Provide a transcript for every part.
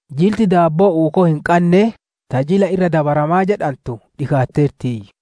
Jilti Daabboo Uukoo Hin Qannee, ta Jila Irra Dabarama jedhantu dhikaatteertiiyyu.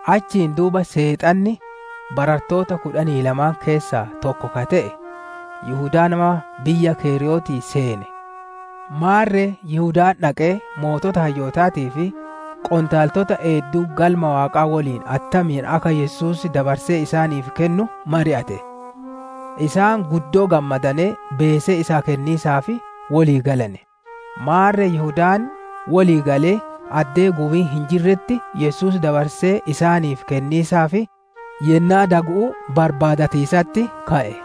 Achiin duuba Seexanni, barattoota kudhanii lamaan keessaa tokko ka te'e, Yihudaa nama biyya Keriyootii seene. Maarre Yihudaan dhaqee sooreyyii hayyootaatii fi qondaaltota eedduu Galma Waaqaa woliin attamiin akka Yesuus dabarsee isaaniif kennu mari'ate. Isaan guddoo gammadanee beesee isaaf kenniisaaf wolii galane. Maarre Yihudaan wolii galee, addee gumiin hin jirretti Yesuus dabarsee isaaniif kenniisaaf, yennaa dagu'uu barbaadatiisatti ka'e.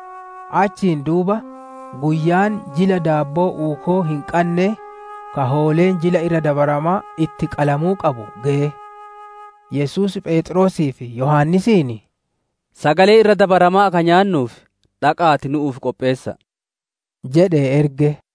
Achiin duuba guyyaan Jila Daabboo Uukoo Hin Qannee, ka hooleen Jila Irra Dabaramaa itti qalamuu qabu geye. Yesuus Pheexroosii fi Yohaannisiin, «Sagalee Jila Irra Dabaramaa akka nyaannuuf, dhaqa'aatii nu'uuf qopheessa'a!» jedhee erge.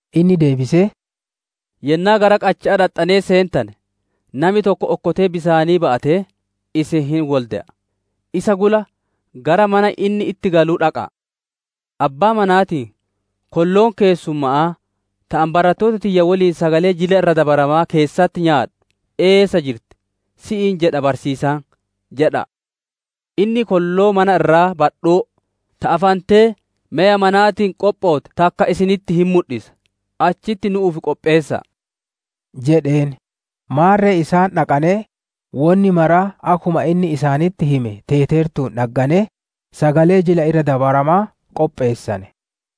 Inni deebisee, «Yennaa gara qacha'aa dhaxxanee seentane, nami tokko okkotee bisaanii ba'atee isin hin wolde'a; isa gula gara mana inni itti galuu dhaqa'a. Abbaa manaatiin, ‹Kolloon keessumma'aa ta ani barattoota tiyya woliin sagalee Jila Irra Dabaramaa keessatti nyaadhu eessa jirti? Si'iin jedha barsiisaan› jedha'a. Inni kolloo mana irraa badhoo, ta afantee meya manaatiin qophootte takka isinitti hin mudhisa. Achitti nu'uuf qopheessa'a!» jedheen. Maarre isaan dhaqanee wonni maraa akkuma inni isaanitti hime teeteertuun dhagganee, sagalee Jila Irra Dabaramaa qopheessane.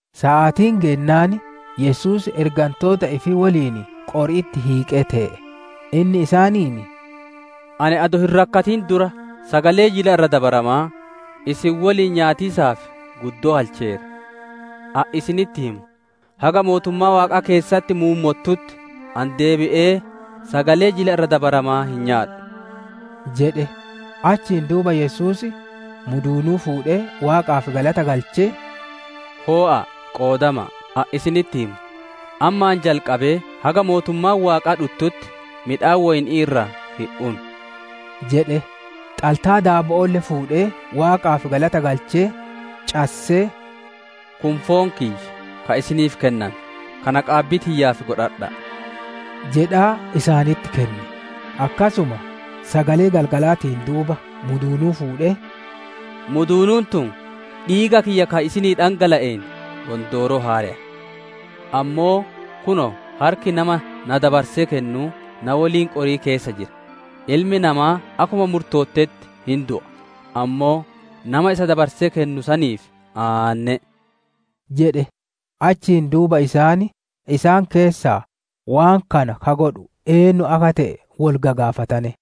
Saatiin geennaan, Yesuus ergantoota ifii woliin qori'itti hiiqee tee'e. Inni isaaniin, «Ani adoo hin rakkatin dura sagalee Jila Irra Dabaramaa isin woliin nyaatiisaaf guddoo halcheera. Ani isinitti hima, haga mootummaa Waaqaa keessatti muummottutti, ani deebi'ee sagalee Jila Irra Dabaramaa hin nyaadhu» jedhe. Achiin duuba Yesuus muduunuu fuudhee, Waaqaaf galata galchee, «Hoo'aa, qoodama'a! Ani isinitti hima, ammaan jalqabee haga mootummaan Waaqaa dhuttutti midhaan woyni'ii irraa hin unu» jedhe. Xaltaa daabbo'oolle fuudhee, Waaqaaf galata galchee, cassee, «Kun foon kiyya, ka isiniif kenname; kana qaabbii tiyyaaf godhadha'a!» jedhaa isaanitti kenne. Akkasuma, sagalee galgalaatiin duuba muduunuu fuudhee, «Muduunuun tun dhiiga kiyya ka isinii dhangala'een, gondooroo haareya. Ammoo kunoo, harki nama na dabarsee kennuu na woliin qorii keessa jira! Ilmi Namaa akkuma murtoottetti hin du'a; ammoo nama isa dabarsee kennu saniif aanne'e!» jedhe. Achiin duuba isaan, isaan keessaa waan kana ka godhu eennu akka te'e wol gagaafatane.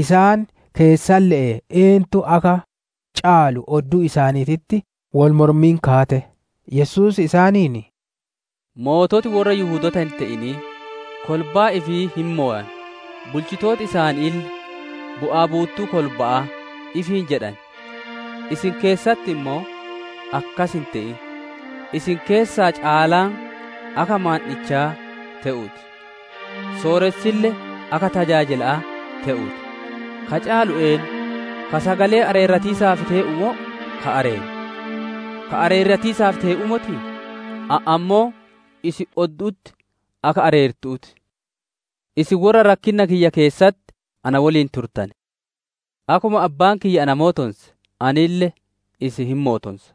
Isaan keessalle'ee eentu akka caalu odduu isaaniititti wol mormiin kaate. Yesuus isaaniin, «Moototi worra Yihudoota hin te'inii kolbaa ifii hin mowan; bulchitooti isaaniille, ‹Bu'aa buuttuu kolba'aa› ifiin jedhan. Isin keessatti ammoo akkas hin te'in; isin keessaa caalaan akka maandhichaa te'uu ti; sooressille akka tajaajila'aa te'uu ti. Ka caalu eennu? Ka sagalee areerratiisaaf tee'u moo, ka areeru? Ka areerratiisaaf tee'uu motii? Ani ammoo isin oddu'utti akka areertu'uu ti. Isin worra rakkinna kiyya keessatti na woliin turtane. Akkuma abbaan kiyya ana mootonse, anille isin hin mootonsa.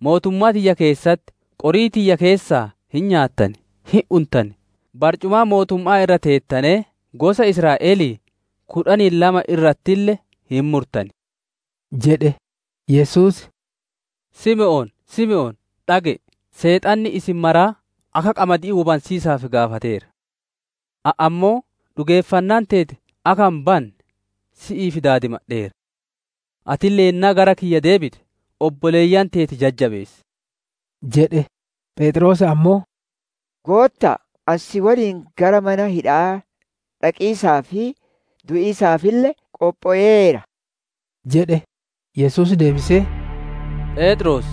Mootummaa tiyya keessatti qorii tiyya keessaa hin nyaattan, hin untan, barcumaa mootumma'aa irra teettanee gosa Israa'elii kudhanii lama irrattille hin murtan» jedhe. Yesuus, «Simoon, Simoon, dhage'i! Seexanni isin maraa akka qamadi'ii wobansiisaaf gaafateera. Ani ammoo dhugeeffannaan teeti akka hin banne si'iif daadimadheera. Atille yennaa gara kiyya deebite, obboleeyyan teeti jajjabeessi!» jedhe. Pheexroos ammoo, «Gootta'a, ani si woliin gara mana hidha'aa dhaqiisaa fi du'iisaafille qophoweera» jedhe. Yesuus deebisee, «Pheexroos,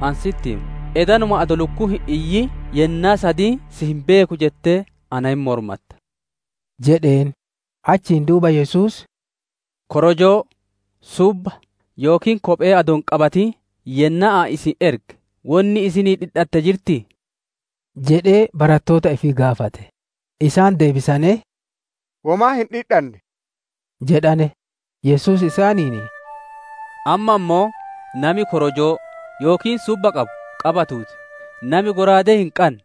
ani sitti hima, edanuma adoo lukkuun hin iyyin yennaa sadiin si hin beeku jettee na hin mormatta» jedheen. Achiin duuba Yesuus, «Korojoo, subba yookiin kophee adoo hin qabatin yennaa ani isin erge, wonni isinii dhidhatte jirti?» jedhee barattoota ifii gaafate. Isaan deebisanee, «Womaa hin dhidhanne!» jedhane. Yesuus isaaniin, «Amma ammoo, nami korojoo, yookiin subba qabu qabatuu ti; nami shallaagaa hin qanne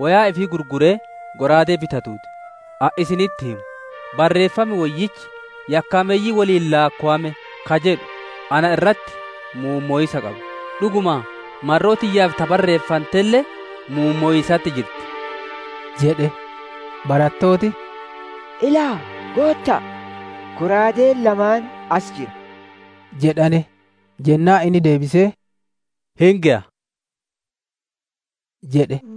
woyaa ifii gurguree shallaagaa bitatuu ti. Ani isinitti hima, Barreeffam Woyyichi, ‹Yakkaameyyii woliin laakkowame› ka jedhu, na irratti muummowiisa qaba; dhugumaan marroo tiyyaaf ta barreeffantelle muummowiisatti jirti» jedhe. Barattooti, «Ilaa, Gootta'a, shallaagaan lamaan as jira» jedhane. Jennaan inni deebisee, «Hin geya!» jedhe.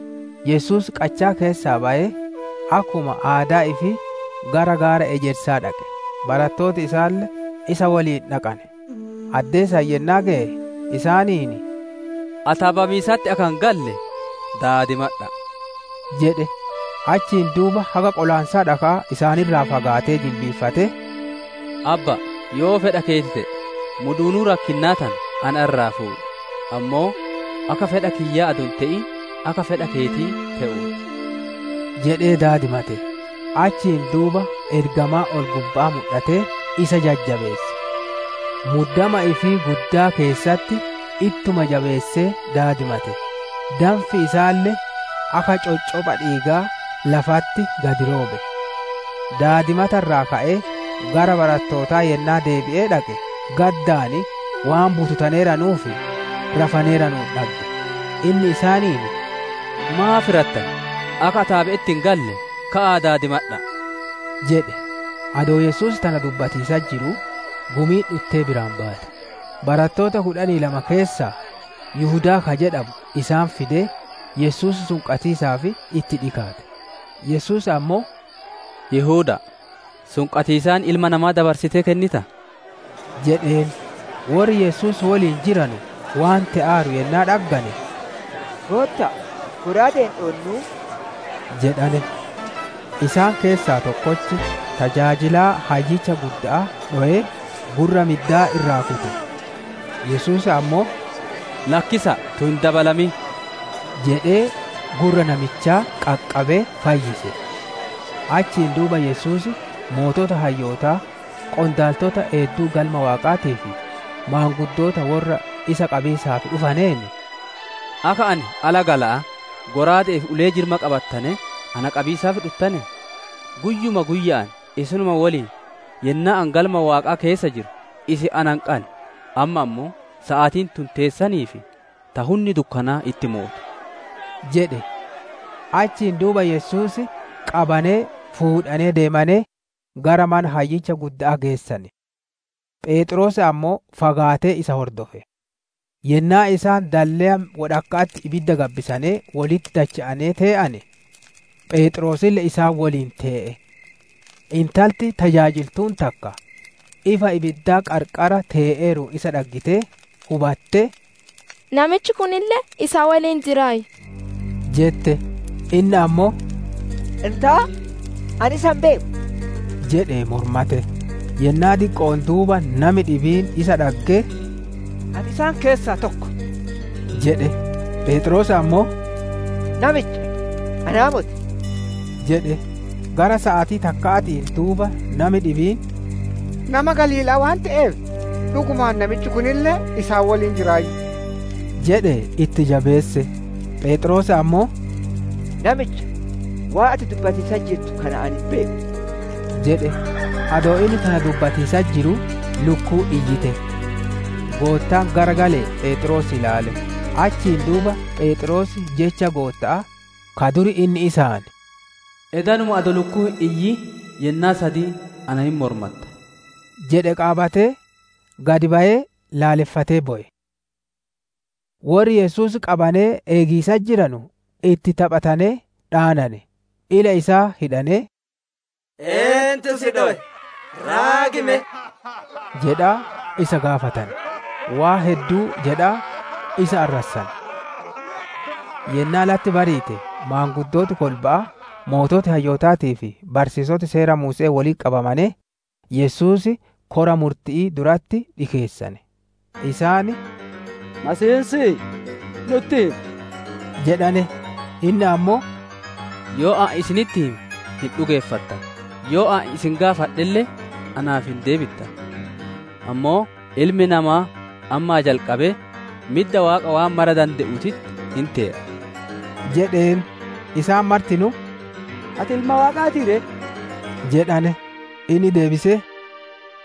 Yesuus qachaa keessaa bayee, akkuma aadaa ifii gara Gaara Ejersaa dhaqe; barattooti isaalle isa woliin dhaqane. Addee san yennaa geye, isaaniin, «Ataabamiisatti akka hin galle daadimadha'a!» jedhe. Achiin duuba haga qolaansaa dhaka'aa isaan irraa fagaatee jilbiiffatee, «Abba'a, yoo fedha keeti te'e, muduunuu rakkinnaa tana na irraa fuudhi; ammoo akka fedha kiyyaa adoo hin te'in, akka fedha keetii te'uu ti!» jedhee daadimate. Achiin duuba ergamaan ol-gubba'aa mudhatee isa jajjabeesse. Muddama ifii guddaa keessatti ittuma jabeessee daadimate; danfi isaalle akka coccopha dhiigaa lafatti gad roobe. Daadimata irraa ka'ee gara barattootaa yennaa deebi'ee dhaqe, gaddaan waan bututaneeranuuf rafaneeranuun dhagge. Inni isaaniin, «Maaf rattan? Akka ataabe'etti hin galle ka'a'aatii daadimadha'a!» jedhe. Adoo Yesuus tana dubbatiisatti jiruu, gumiin dhuttee biraan baate; barattoota kudhanii lama keessaa Yihudaa ka jedhamu isaan fidee, Yesuus sunqatiisaaf itti dhikaate. Yesuus ammoo, «Yihuda'a, sunqatiisaan Ilma Namaa dabarsitee kennitaa?» jedheen. Worri Yesuus woliin jiranu waan te'aaru yennaa dhaggane, «Gootta'a, shallaaga'aan dhoonnuu?» jedhane. Isaan keessaa tokkochi, tajaajilaa hayyicha gudda'aa dhowee, gurra middaa irraa kute. Yesuus ammoo, «Lakkisa'a! Tun hin dabalamin» jedhee gurra namichaa qaqqabee fayyise. Achiin duuba Yesuus sooreyyii hayyootaa, qondaaltota eedduu Galma Waaqaatii fi maanguddoota worra isa qabiisaaf dhufaneen, «Akka ani alagala'aa shallaaga'aa fi ulee-jirma qabattanee na qabiisaaf dhuttanee? Guyyuma guyya'aan isinuma woliin yennaa ani Galma Waaqaa keessa jiru, isin na hin qanne. Amma ammoo, saatiin tun teessanii fi ta hunni dukkanaa itti mootu» jedhe. Achiin duuba Yesuus qabanee, fuudhanee deemanee gara mana hayyicha gudda'aa geessane. Pheexroos ammoo fagaatee isa hordofe. Yennaa isaan badhinna dalleyaa wodhakka'atti ibidda gabbisanee wolitti dacha'anee tee'ane, Pheexroosille isaan woliin tee'e. Intalti tajaajiltuun takka, ifa ibiddaa qarqara tee'eeruun isa dhaggitee, hubattee, «Namichi kunille isa woliin jiraayyu» jette. Inni ammoo, «Intaa, ani isa hin beeku» jedhee mormate. Yennaa diqqo'oon duuba nami dhibiin isa dhaggee, «Ati isaan keessaa tokko» jedhe. Pheexroos ammoo, «Namicha, anaa moti!» jedhe. Gara saatii takka'aatiin duuba nami dhibiin, «Nama Galiila'aa waan te'eef, dhugumaan namichi kunille isaan woliin jiraayyu» jedhee itti jabeesse. Pheexroos ammoo, «Namicha, waan ati dubbatiisatti jirtu kana ani hin beeku!» jedhe. Adoo inni tana dubbatiisatti jiruu, lukkuun iyyite. Goottaan garagalee Pheexroos ilaale. Achiin duuba Pheexroos Jecha Gootta'aa, ka duri inni isaan, «Edanuma adoo lukkuun hin iyyin yennaa sadiin na hin mormatta» jedhe qaabatee, gad bayee laaleffatee bowe. Worri Yesuus qabanee eegiisatti jiranu itti taphatanee dhaanane. Ila isaa hidhanee, «Eentu si dhowe? Raagi me!» jedhaa isa gaafatane. Waan hedduu jedhaa isa arrassane. Yennaa latti bariite maanguddooti kolba'aa, sooreyyiin hayyootaatii fi barsiisoti Seera Muuse'ee wolitti qabamanee, Yesuus kora murti'ii duratti dhikeessane. Isaan, «Masiihiin si'ii? Nutti himi!» jedhane. Inni ammoo, «Yoo ani isinitti hime, hin dhugeeffattanu; yoo ani isin gaafadhelle naaf hin deebittanu. Ammoo Ilmi Namaa ammaa jalqabee, midda Waaqa waan mara dande'uutitti hin tee'a» jedheen. Isaan martinuu, «Ati Ilma Waaqaatii ree?» jedhane. Inni deebisee,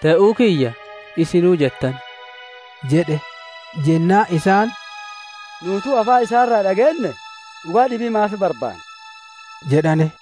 «Te'uu kiyya isinuu jettane» jedhe. Jennaan isaan, «Nuutuu afaan isaa irraa dhageennee, dhugaa dhibii maaf barbaanna?» jedhane.